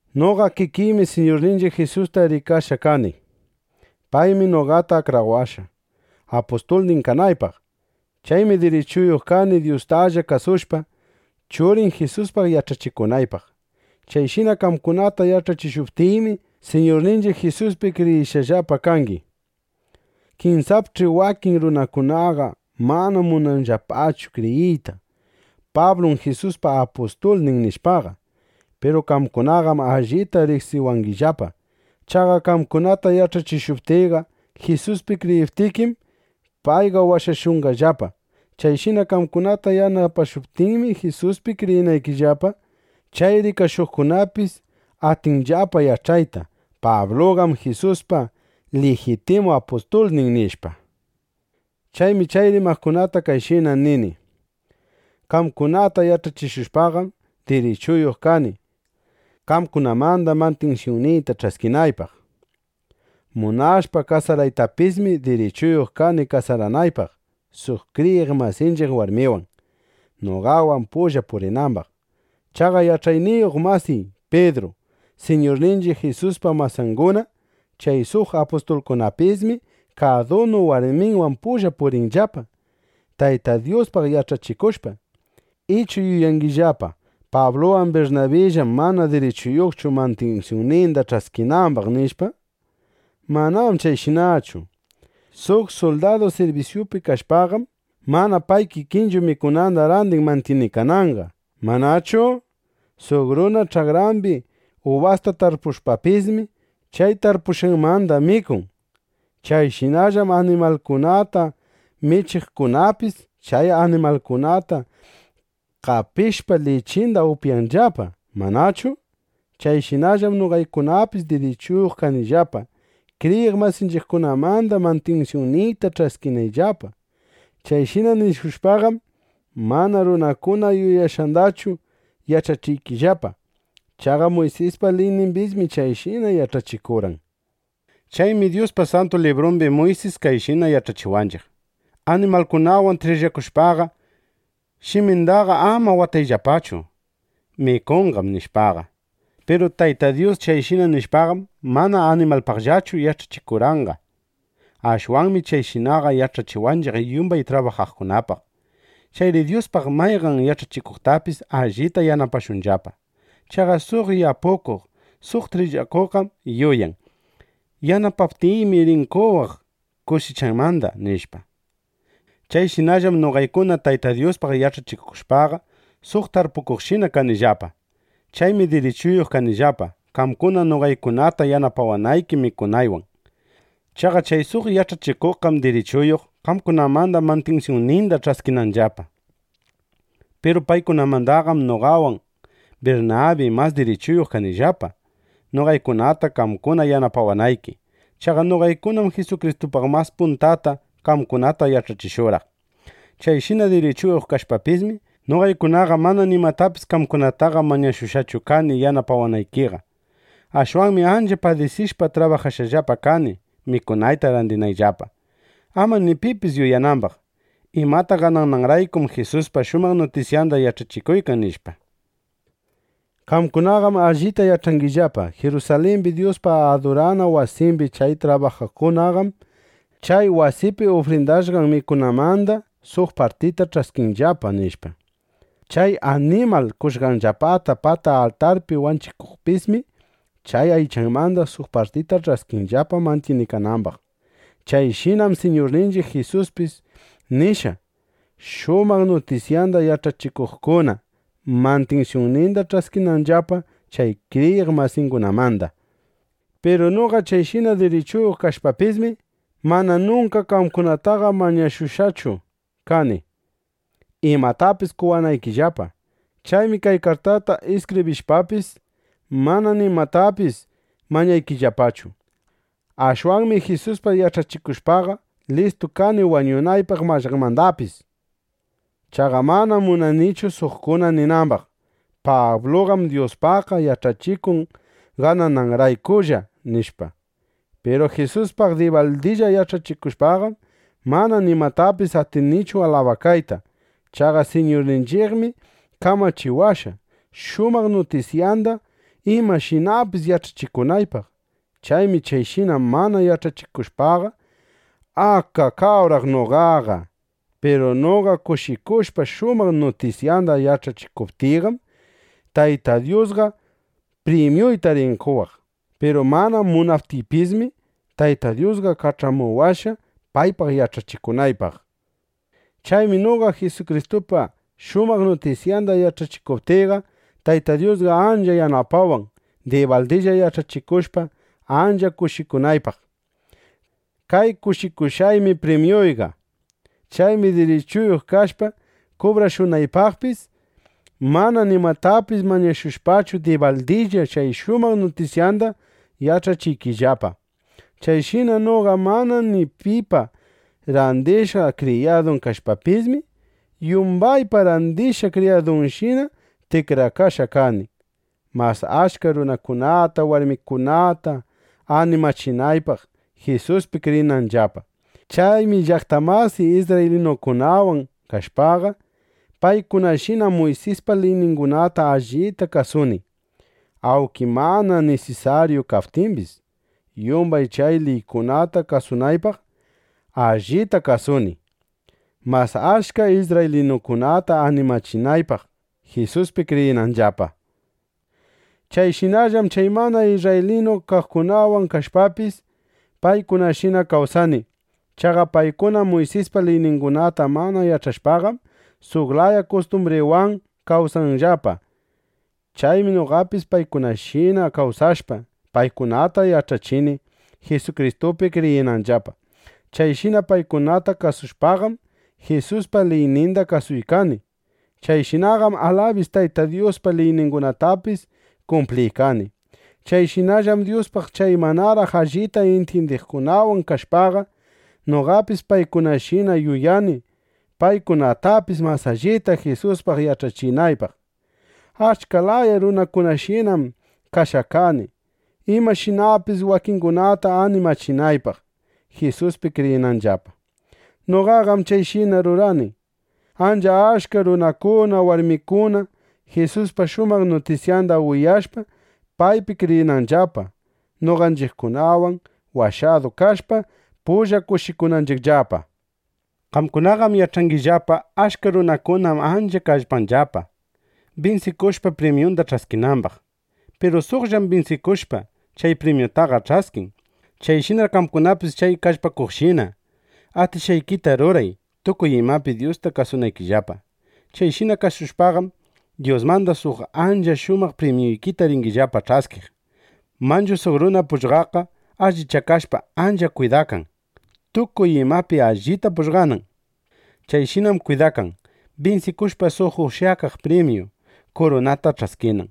Noqa kikiymi Siñurninchiq Jisusta rikashqa kani. Paymi noqata akrawashqa, apustulnin kanaypaq. Chaymi dirichuyuq kani, Dyustalla kasushpa, Churin Jisuspaq yach'achikunaypaq. Chayshina qamkunata yach'achishuptiymi, Siñurninchiq Jisuspi kriyishqallapa kangi. Kinsapch'i wakin runakunaqa mana munanllapachu kriyiyta: Pablum Jisuspa apustulnin, nishpaqa. Piru qamkunaqam allita riqsiwangillapa. Chaqa qamkunata yach'achishuptiyqa, Jisuspi kriyiptikim, payqa washashushqallapa. Chayshina qamkunata yanapashuptiymi Jisuspi kriyinaykillapa, chay rikashuqkunapis atinllapa yach'ayta: Pabluqam Jisuspa lijitimu apustulnin, nishpa. Chaymi chay rimaqkunata kayshina nini: Qamkunata yach'achishushpaqam, dirichuyuq kani, qamkunamanda mantinsyunniyta ch'askinaypaq. Munashpa kasaraytapismi, dirichuyuq kani kasaranaypaq suq kriyiq masinchiq warmiwan, noqawan pulla purinambaq. Chaqa yach'achikuq masiy Pidru, Siñurninchiq Jisuspa masanguna, chay suq apustulkunapismi kadunu warminwan pulla purinllapa, Tayta Dyuspaq yach'achikushpa. ¿Ichu yuyangillapa: Pabluwan Birnabillam mana dirichuyuqchu mantinsyunninda ch'askinambaq, nishpa? (Manam chayshinachu.) Suq suldadu sirbisyupi kashpaqam, mana pay kikinchu mikunanda randin mantyinikananqa, ¿manachu? Suq runa ch'akrambi ubasta tarpushpapismi, chay tarpukushqanmanda mikun. Chayshinallam animalkunata michiqkunapis, chay animalkunata qapishpa, lichinda upyanllapa, ¿manachu? (Chayshinallam noqaykunapis dirichuyuq kanillapa, kriyiq masinchiqkunamanda mantinsyunniyta ch'askinayllapa.) Chayshina nishushpaqam, mana runakuna yuyashqandallachu yach'achiykillapa. Chaqa Muysispa liynimbismi chayshina yach'achikurqan. Chaymi Dyuspa Santu Librumbi Muysis kayshina yach'achiwanchiq: “Animalkunawan trillakushpaqa, shimindaqa ama watayllapachu. Mikunqam”, nishpaqa. Piru Tayta Dyus chayshina nishpaqam, mana animalpaqllachu yach'achikurqanqa. Ashwanmi chayshinaqa yach'achiwanchiq yumbay trabajaqkunapaq. Chayri Dyuspaq mayqan yach'achikuqtapis allita yanapashunllapa. Chaqa suq yapukuq, suq trillakuqqam yuyan: Yanapaptiymi, rin qowaq kusichanmanda, nishpa. Chayshinallam noqaykuna Tayta Dyuspaq yach'achishushpaqa, suq tarpukuqshina kanillapa. Chaymi dirichuyuq kanillapa, qamkuna noqaykunata yanapawanayki mikunaywan. Chaqa chay suq yach'achikuqkunaqam dirichuyuq, qamkunamanda mantinsyunninda ch'askinanllapa. Piru paykunamandaqam noqawan Birnabi mas dirichuyuq kanillapa, noqaykunata qamkuna yanapawanayki. (Chaqa noqaykunam Jisukristupaq mas puntata qamkunata yach'achishurqaq.) Chayshina dirichuyuq kashpapismi, noqaykunaqa mana nimatapis qamkunataqa mañashushqachu kani yanapawanaykiqa. Ashwanmi ancha padisishpa trabajashqallapa kani, mikunayta randinayllapa, ama ni pipis yuyanambaq: Imata ganananraykum Jisuspa shumaq nutisyanda yach'achikuykan, nishpa. Qamkunaqam allita yach'angillapa: Jirusalimbi Dyuspa adurana wasimbi chay trabajaqkunaqam chay wasipi ufrindashqan mikunamanda suq partita ch'askinllapa, nishpa. Chay animal qoshqanllapata pata altarpi wanchiqkunapismi chay aychamanda suq partita ch'askinllapa mantyinikanambaq. Chayshinam Siñurninchiq Jisuspis nishqa, shumaq nutisyanda yach'achikuqkuna mantinsyunninda ch'askinanllapa chay kriyiq masingunamanda. Piru noqa chayshina dirichuyuq kashpapismi, mana nunka qamkunataqa mañashushqachu kani, imatapis qowanaykillapa. Chaymi kay kartata iskibrishpapis, mana nimatapis mañaykillapachu. Ashwanmi Jisuspaq yach'achikushpaqa, listu kani wañunaypaq imapis mallaqmanda. Chaqa manam munanichu, suqkuna ninambaq: “Pabluqam Dyuspaqqa yach'achikun ganananraykulla”, nishpa. Piru Jisuspaq dibaldilla yach'achikushpaqam, mana nimatapis atinichu alabakayta. Chaqa Siñurninchiqmi kamachiwashqa, shumaq nutisyanda imashinapis yach'achikunaypaq. Chaymi chayshina mana yach'achikushpaqa, ¡akakawraq noqa! Piru noqa kushikushpa, shumaq nutisyanda yach'achikuptiyqam, Tayta Dyusqa primyuyta rin qowaq. Piru mana munaptiypismi, Tayta Dyusqa kach'amuwashqa, paypaq yach'achikunaypaq. Chaymi noqa Jisukristupa shumaq nutisyanda yach'achikuptiyqa, Tayta Dyusqa ancha yanapawan, dibaldilla yach'achishushpa, ancha kushikunaypaq. Kay kushikushqaymi primyuyqa. Chaymi dirichuyuq kashpa kubrashunaypaqpis, mana nimatapis mañashushpachu, dibaldilla chay shumaq nutisyanda yach'achiykillapa. Chayshina noqa mana ni pipa randishqa kriyadun kashpapismi, yumbaypa randishqa kriyadunshina tikrakashqa kani, mas achka runakunata, warmikunata animachinaypaq, Jisuspi kriyinanllapa. Chaymi llaqta masiy isrraylinukunawan kashpaqa, paykunashina Muysispa liyningunata allita kasuni. Awnki mana nisisaryu kaptimbis yumbay chay liykunata kasunaypaq, allita kasuni, mas achka isrraylinukunata animachinaypaq, Jisuspi kriyinanllapa. Chayshinallam chay mana isrraylinu kaqkunawan kashpapis, paykunashina kawsani. Chaqa paykuna, Muysispa liyningunata mana yach'ashpaqam, suq laya kustumbrikunawan kawsanllapa. Chaymi noqapis paykunashina kawsashpa, paykunata yach'achini, Jisukristupi kriyinanllapa. Chayshina paykunata kuyashpaqam, Jisuspa liyninda kasuykani. Chayshinaqam alabis Tayta Dyuspa liyningunatapis kumpliykani. Chayshinallam Dyuspaq chay manaraq allita intyindiqkunawan kashpaqa, noqapis paykunashina yuyani, paykunatapis mas allita Jisuspaq yach'achinaypaq. Achka laya runakunashinam kashqa kani, imashinapis wakingunata animachinaypaq, Jisuspi kriyinanllapa. Noqaqam chayshina rurani, ancha achka runakuna, warmikuna Jisuspa shumaq nutisyanda uyashpa, paypi kriyinanllapa, noqanchiqkunawan washadu kashpa, pulla kushikunanchiqllapa. Qamkunaqam yach'angillapa: Achka runakunam ancha kallpanllapa, binsikushpa, primyunda ch'askinambaq. Piru suqllam binsikushpa, chay primyutaqa ch'askin. Chayshinar qamkunapis chay kallpaqkunashina, atishqaykita ruray, tukuy imapi Dyusta kasunaykillapa. Chayshina kasushpaqam, Dyusmanda suq ancha shumaq primyuykita ringillapa ch'askiq. Manchu suq runa pugllaqqa allichakashpa, ancha kwidakan, tukuy imapi allita pugllanan. Chayshinam kwidakan, binsikushpa, suq ushyakaq primyu kurunata ch'askinan.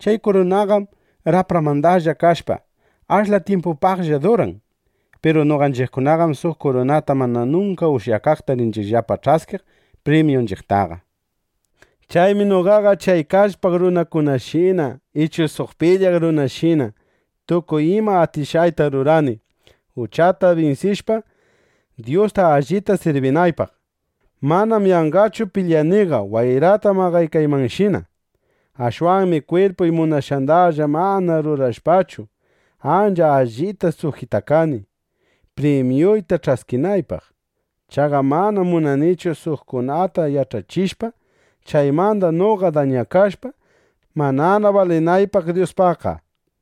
Chay kurunaqam rapramandalla kashpa, ashla tyimpupaqlla duran. Piru noqanchiqkunaqam suq kuruna mana nunka ushyakaqta rinchiqllapa ch'askiq primyunchiqtaqa. Chaymi noqaqa chay kallpaq runakunashina ichu suq pilyaq runashina, tukuy ima atishqayta rurani, uchata binsishpa, Dyusta allita sirbinaypaq. Manam yanqallachu pilyaniqa wayrata maqaykaymanshina. Ashwanmi kwirpuy munashqandalla mana rurashpachu, ancha allita sujitakani, primyuyta ch'askinaypaq. Chaqa mana munanichu suqkunata yach'achishpa, chaymanda noqa dañakashpa, manana balinaypaq Dyuspaqqa.